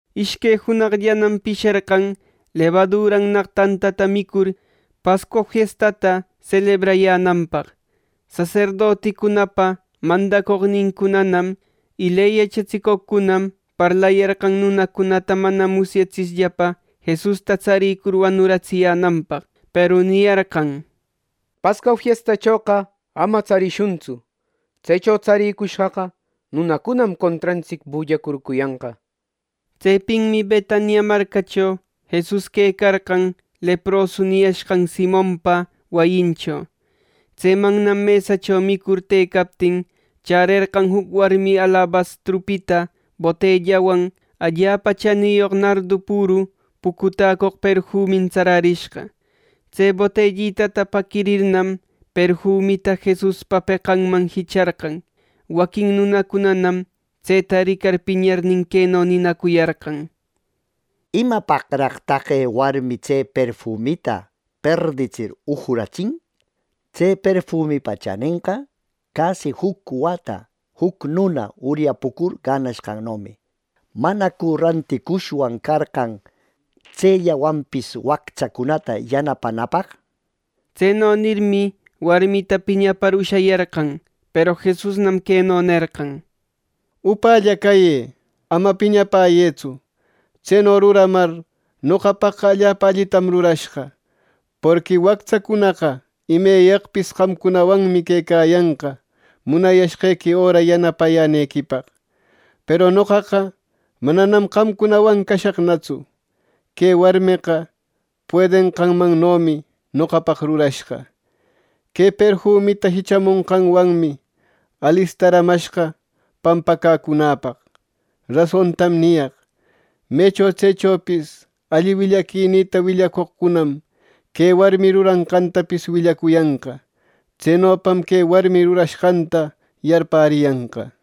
Ishque junaqllanam pisherqan lebadurannaq tantata micur Pascua fiestata selebrayänanpaq. Saserdoticunapa mandacoqnincunanam y ley yachatsicoqcunam parlayarqan, nunacunata mana musyatsishllapa Jesusta tsarïcur wanuratsiyänanpaq. Peru niyarqan: —Pascua fiestachoqa ama tsarishuntsu. Tsecho tsarïcushqaqa nunacunam contrantsic bullacurcuyanqa —nirmi. Tsepinmi Betania marcacho Jesus quecarqan leprosu niyashqan Simonpa wayincho. Tsemannam mesacho micur tëcaptin chärerqan juc warmi alabastrupita botellawan allapa chaniyoq nardu püru pucutäcoq perfumin tsararishqa. Tse botellitata paquirirnam, perfumita Jesuspa peqanman jicharqan. Waquin nunacunanam tseta ricar piñarnin, queno ninacuyarqan: —¿Imapaqraq taqe warmi tse perfumita perditsir ujuratsin! Tse perfumipa chanenqa casi juc wata juc nuna uryapucur ganashqannomi. ¿Manacu ranticushwan carqan tsellawanpis wactsacunata yanapanapaq! —nir. Tseno nirmi, warmita piñapar ushayarqan. Peru Jesusnam queno nerqan: —¡Upälla cayë! ¡Ama piñapäyëtsu! Tseno ruramar noqapaqqa allapa allitam rurashqa. Porqui wactsacunaqa imeyaqpis qamcunawanmi quecayanqa munayashqequi öra yanapayänequipaq, peru noqaqa mananam qamcunawan cashaqnatsu. Que warmeqa puedenqanmannomi noqapaq rurashqa. Que perfumita jichamonqanwanmi alistaramashqa pampacäcunäpaq. Rasontam niyaq: Mecho tsechopis alli willaquinïta willacoqcunam que warmi ruranqantapis willacuyanqa. Tsenopam que warmi rurashqanta yarpäriyanqa.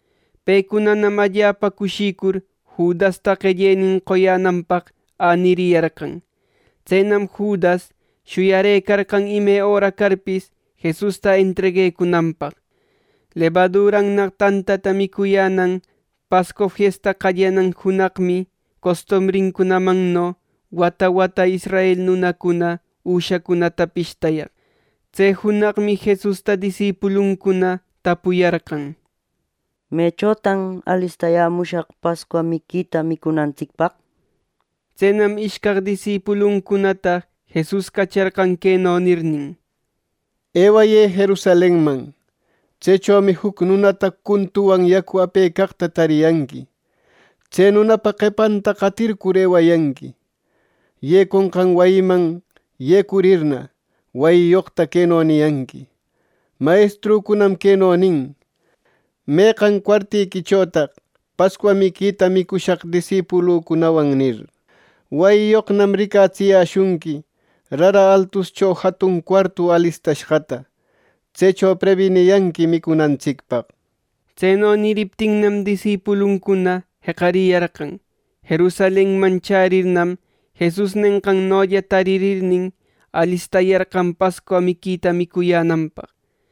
Pecunanam allapa cushicur Judasta qellenin qoyänanpaq äniriyarqan. Tsenam Judas shuyarëcarqan ime öra carpis Jesusta entreguecunanpaq. Lebadurannaq tantata micuyänan Pascua fiesta qallanan junaqmi costumbrincunamanno wata wata israel nunacuna üshacunata pishtayaq. Tse junaqmi Jesusta disipuluncuna tapuyarqan: —¿Mechotan alistayämushaq Pascua miquita micunantsicpaq? —nir. Tsenam ishcaq disipuluncunata Jesus cacharqan queno nirnin: —Ewayë Jerusalenman. Tsechomi juc nunata cuntuwan yacu apecaqta tariyanqui. Tse nunapa qepanta qatircur ewayanqui. Yeconqan wayiman yecurirna, wayiyoqta queno niyanqui: ‘Mayestrücunam queno nin: ¿Meqan cuartiquichotaq Pascua miquita micushaq disipulücunawan?’ nir. Wayiyoqnam ricatsiyäshunqui rara altuscho jatun cuartu alistashqata. Tsecho prebiniyanqui micunantsicpaq. Tseno niriptinnam, disipuluncuna jeqariyarqan. Jerusalenman chärirnam, Jesus nenqannolla tarirnin, alistayarqan Pascua miquita micuyänanpaq.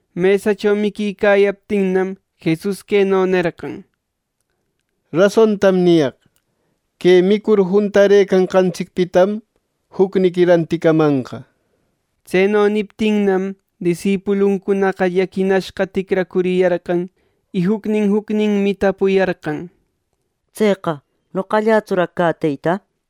Mesacho miquicayaptinnam, Jesus queno nerqan: —Rasontam niyaq: Que micur juntareqanqantsicpitam jucniqui ranticamanqa. Tseno niptinnam, disipuluncunaqa llaquinashqa ticracuriyarqan, y jucnin jucninmi tapuyarqan: —Tseqa ¿noqallätsuraq cä, Teyta! —nir.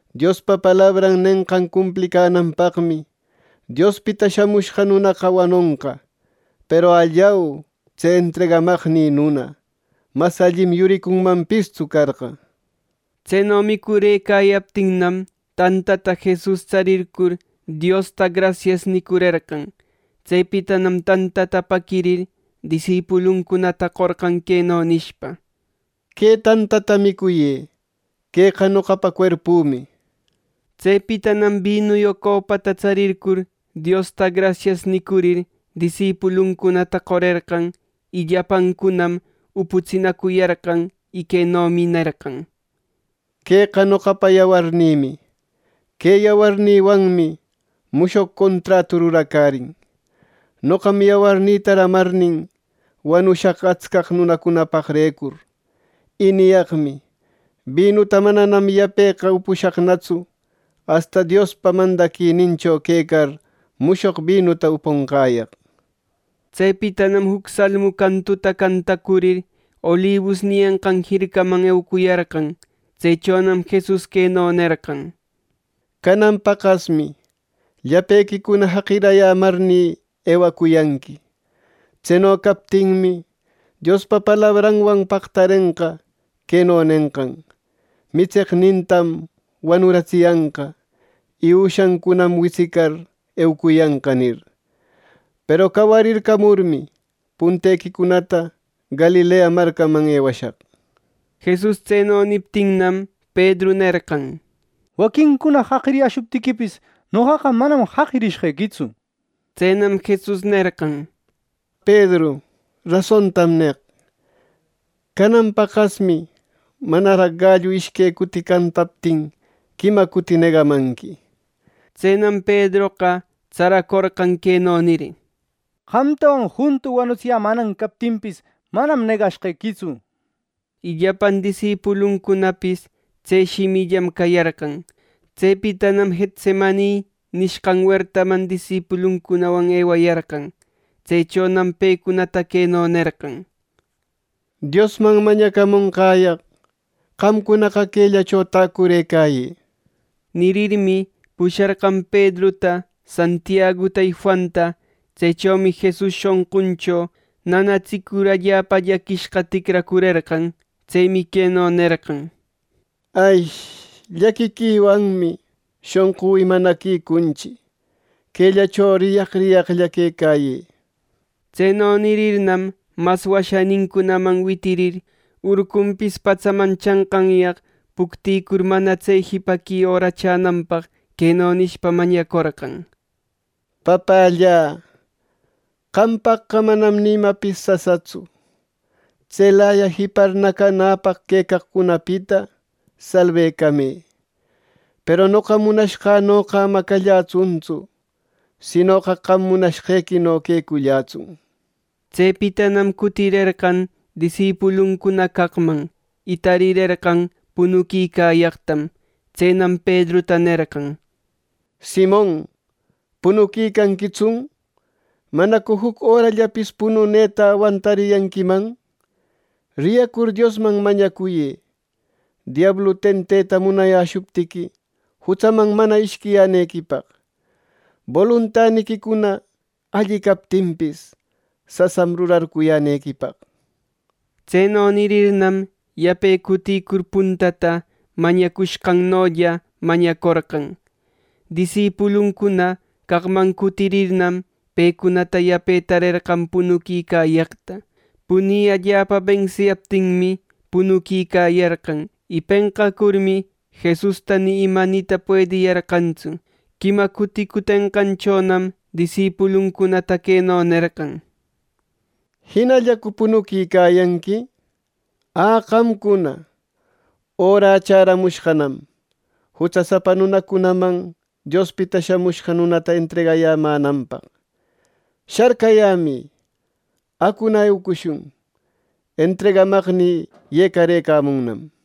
Diospa palabran nenqan cumplinanpaqmi Diospita Shamushqa Nunaqa wanonqa; peru ¡allau, tse entregamaqnï nuna! Mas allim yuricunmanpistsu carqa —nir. Tseno micurëcayaptinnam, tantata Jesus tsarircur Diosta “Grasias” nicurerqan. Tsepitanam tantata paquirir, disipuluncunata qorqan queno nishpa: —Que tantata micuyë. Queqa noqapa cuerpümi —nishpa. Tsepitanam binuyoq copata tsarircur Diosta “Grasias” nicurir, disipuluncunata qorerqan, y llapancunam uputsinacuyarqan. Y quenomi nerqan: —Queqa noqapa yawarnïmi. Que yawarnïwanmi mushoq contratu ruracärin. Noqam yawarnïta ramarnin, wanushaq atscaq nunacunapaqrecur. Y niyaqmi: Binuta mananam yapeqa upushaqnatsu asta Diospa mandaquinincho quecar mushoq binuta upunqäyaq. Tsepitanam juc salmu cantuta cantacurir, Olibus niyanqan jircaman eucuyarqan. Tsechonam Jesus queno nerqan: —˻Canan paqasmi˼ llapequicuna jaqiricayämarnï, ewacuyanqui. Tseno captinmi, Diospa palabranwan pactarenqa queno nenqan: ‘Mitseqnintam wanuratsiyanqa y üshancunam witsicar, eucuyanqa’ nir. Peru cawarircamurmi, puntequicunata Galilea marcaman ewashaq. Jesus tseno niptinnam, Pedru nerqan: —Waquincuna jaqiriyäshuptiquipis, noqaqa manam jaqishqequitsu —nir. Tsenam Jesus nerqan: —Pedru, rasontam neq: Canan paqasmi manaraq gallu ishque cuti cantaptin quima cuti negamanqui —nir. Tsenam Pedroqa tsaracorqan queno nir: —Qamtawan juntu wanutsiyämänan captinpis, manam negashqequitsu —nir. Y llapan disipuluncunapis tse shimillam cayarqan. Tsepitanam Getsemani nishqan wertaman disipuluncunawan ewayarqan. Tsechonam pecunata queno nerqan: —Diosman mañacamunqäyaq, qamcunaqa quellacho täcurëcayë —nir. Nirirmi, pusharqan Pedruta, Santiaguta y Juanta. Tsechomi Jesus shonquncho nanatsicur allapa llaquishqa ticracurerqan. Tsemi queno nerqan: —¡Llaquiquiwanmi shonqü imanaquicunchi! Quellacho riyaq riyaqlla quecayë. Tseno nirirnam, mas washanincunaman witirir, urcunpis patsaman chanqanyaq puctïcur, mana tse jipaqui öra chänanpaq queno nishpa mañacorqan: —Papällä, qampaqqa manam ni imapis sasatsu. Tselaya jipar nacanäpaq quecaqcunapita salbecamë; peru noqa munashqänoqa ama callätsuntsu, sinoqa qam munashqequino quecullätsun —nir. Tsepitanam cutirerqan disipuluncuna caqman, y tarirerqan punuquicayaqtam. Tsenam Pedruta nerqan: —Simon, ¡punuquicanquitsun! ¿Manacu juc örallapis pununeta awantariyanquiman! Riyacur Diosman mañacuyë, diablu tenteta munayäshuptiqui, jutsaman mana ishquiyänequipaq. Boluntaniquicuna alli captinpis, sasam rurarcuyänequipaq. Tseno nirirnam, yape cutïcur puntata mañacushqannolla mañacorqan. Disipuluncuna caqman cutirirnam, pecunata yape tarerqan punuquicayaqta; puni allapa bensiyaptinmi, punuquicayarqan, y penqacurmi Jesusta ni ima nita puediyarqantsu. Quima cuti cutenqanchonam disipuluncunata queno nerqan: —¿Jinallacu punuquicayanqui? ¡Ä, qamcuna! Örä chäramushqanam jutsasapa nunacunaman Diospita Shamushqa Nunata entregayänanpaq. ¡Sharcayämï! ¡Acuna eucushun! Entregamaqnï yecarëcamunnam —nir.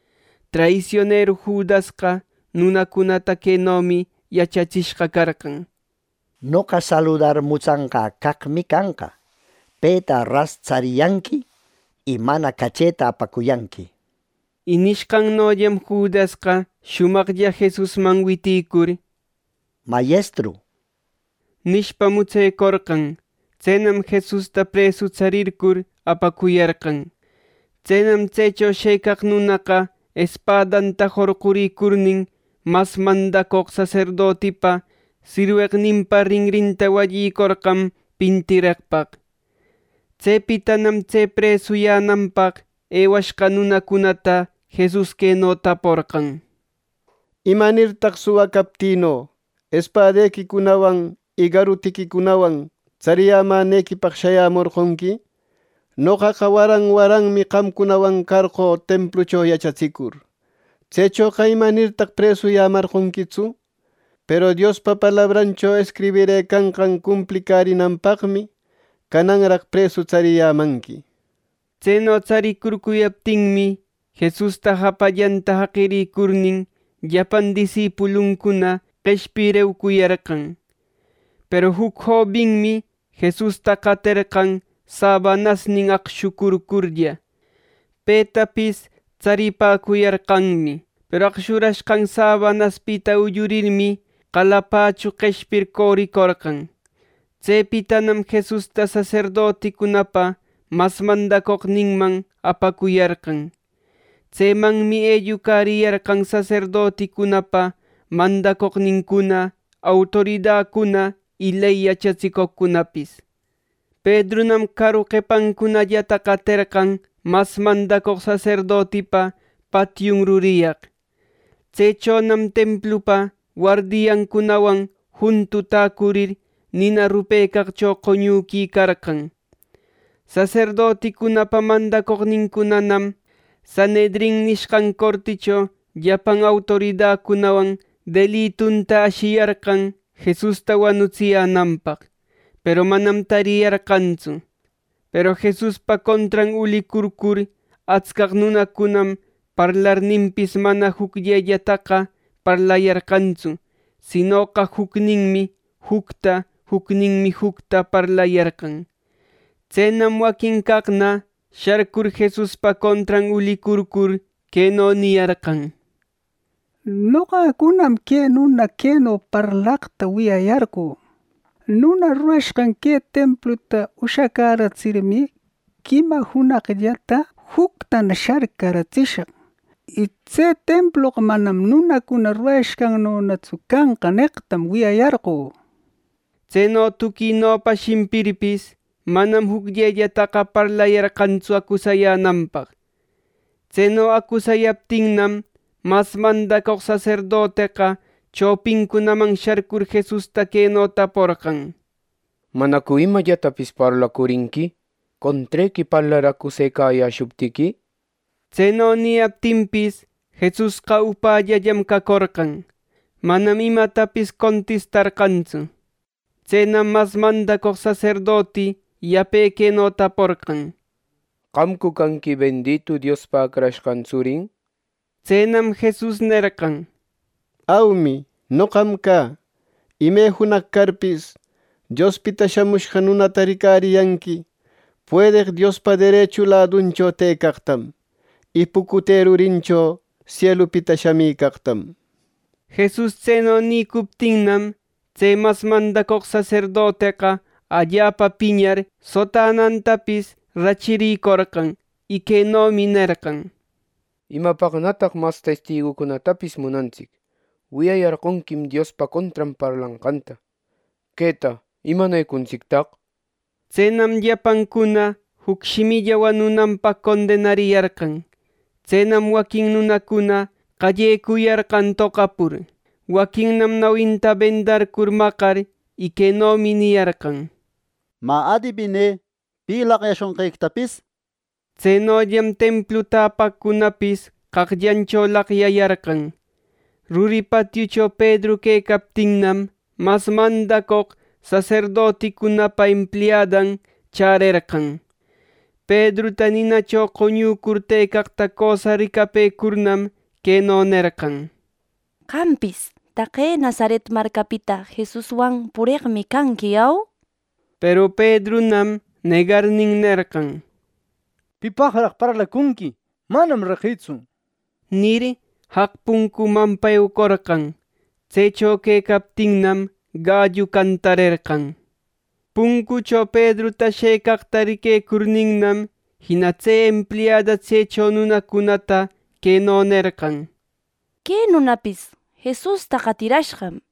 Traisionero Judasqa nunacunata quenomi yachatsishqa carqan, “Noqa saludar mutsanqä caqmi canqa. Peta ras tsariyanqui, y mana cacheta apacuyanqui” nir. Y nishqannollam Judasqa shumaqlla Jesusman witïcur “¡Mayestru!” nishpa, mutsecorqan. Tsenam Jesusta presu tsarircur apacuyarqan. Tsenam tsecho shëcaq nunaqa espadanta jorquricurnin, mas mandacoq saserdotipa sirweqninpa rinrinta wallicorqan pintireqpaq. Tsepitanam tse presuyänanpaq ewashqa nunacunata Jesus queno taporqan: —¿Imanirtaq suwa captïno espadequicunawan y garutiquicunawan tsariyämänequipaq shayämorqonqui? Noqaqa waran waranmi qamcunawan carqö templucho yachatsicur. Tsechoqa ¿imanirtaq presuyämarqonquitsu? Peru Diospa palabrancho escribirëcanqan cumplicärinanpaqmi, cananraq presu tsariyämanqui —nir. Tseno tsaricurcuyaptinmi, Jesusta japallanta jaqirïcurnin, llapan disipuluncuna qeshpir eucuyarqan. Peru juc jobinmi Jesusta qaterqan sabanasnin aqshucurcurlla. Petapis tsaripäcuyarqanmi. Peru aqshurashqan sabanaspita ullurirmi, qalapachu qeshpir coricorqan. Tsepitanam Jesusta saserdoticunapa mas mandacoqninman apacuyarqan. Tsemanmi ellucariyarqan saserdoticunapa mandacoqnincuna, autoridacuna y ley yachatsicoqcunapis Pedrunam caru qepancunallata qaterqan mas mandacoq saserdotipa patiun ruriyaq. Tsechonam templupa wardiancunawan juntu täcurir nina rupecaqcho qoñuquicarqan. Saserdoticunapa mandacoqnincunanam Sanhedrin nishqan corticho llapan autoridacunawan delitunta ashiyarqan Jesusta wanutsiyänanpaq, peru manam tariyarqantsu. Peru Jesuspa contran ulicurcur atscaq nunacuna parlarninpis, manam jucllellataqa parlayarqantsu sinoqa jucninmi jucta, jucninmi jucta parlayarqan. Tsenam waquin caqna sharcur Jesuspa contran ulicurcur queno niyarqan: —Noqacunam que nuna queno parlaqta wiyayarqö: ‘¡Nuna rurashqan que templuta ushacäratsirmi, quima junaqllata juctana sharcaratsishaq! Y tse temploqa manam nunacuna rurayashqannonatsu canqa’ neqtam wiyayarqö. Tseno tuquinopa shimpirpis, manam jucllellataqa parlayarqantsu acusayänanpaq. Tseno acusayaptinnam, mas mandacoq saserdoteqa chopincunaman sharcur Jesusta queno taporqan: —¿Manacu imallatapis parlacurinqui, contrequi parlar acusecayäshuptiqui! Tseno niyaptinpis, Jesusqa upällallam cacorqan; manam imatapis contistarqantsu. Tsenam mas mandacoq saserdoti yape queno taporqan: —¿Qamcu canqui bendito Diospa Acrashqan tsurin? —nir. Tsenam Jesus nerqan: —Aumi, noqam cä. Ime junaq carpis, Diospita Shamushqa Nunata ricariyanqui puedeq Diospa derechu laduncho tëcaqtam, y pucute rurincho sielupita shamicaqtam. Jesus tseno nïcuptinnam, tse mas mandacoq saserdoteqa allapa piñar, sotanantapis rachiricorqan, y quenomi nerqan: —¿Imapaqnataq mas testigucunatapis munantsic! ¡Wiyayarqonquim Diospa contran parlanqanta! ¿Queta imanecuntsictaq! —nir. Tsenam llapancuna juc shimilla wanunanpaq condenariyarqan. Tsenam waquin nunacuna qallecuyarqan toqapur. Waquinnam nawinta bendarcur maqar, y quenomi niyarqan: —Mä, adibinë, ¿pi laqyashonqequitapis! —nir. Tsenollam templu täpaqcunapis qaqllancho laqyayarqan. Ruri patiucho Pedru quecaptinnam, mas mandacoq saserdoticunapa empliadan chärerqan Pedruta ninacho qoñücur tëcaqta cösa ricapëcurnam queno nerqan: —Qampis taqe Nazaret marcapita Jesuswan pureqmi canqui, ¿au? —nir. Peru Pedrunam negarnin nerqan: —¡Pipaqraq parlacunqui, manam reqïtsu! —nir, jaq puncumanpa eucorqan. Tsecho quecaptinnam, gallu cantarerqan. Puncucho Pedruta shëcaqta riquecurninnam, jina tse empliada tsecho nunacunata queno nerqan: —Que nunapis Jesusta qatirashqam —nir.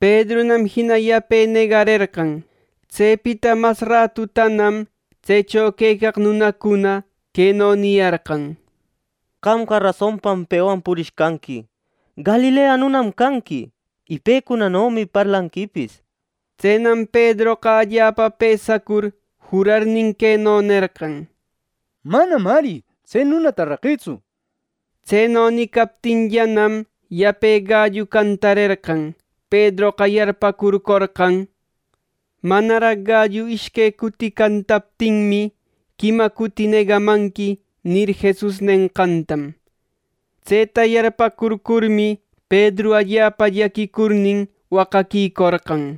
Pedrunam jina yape negarerqan. Tsepita mas ratutanam tsecho quecaq nunacuna queno niyarqan: —Qamqa rasonpam pewan purishqanqui. Galilea nunam canqui, ˻y pecunanomi parlanquipis˼ —nir. Tsenam Pedroqa allapa pësacur jurarnin queno nerqan: —¡Manam ari tse nunata reqïtsu! —nir. Tseno nicaptinllanam, yape gallu cantarerqan. Pedroqa yarpäcurcorqan, “Manaraq gallu ishque cuti cantaptinmi, quima cuti negamanqui” nir, Jesus nenqantam. Tseta yarpäcurcurmi, Pedru allapa llaquicurnin waqaquicorqan.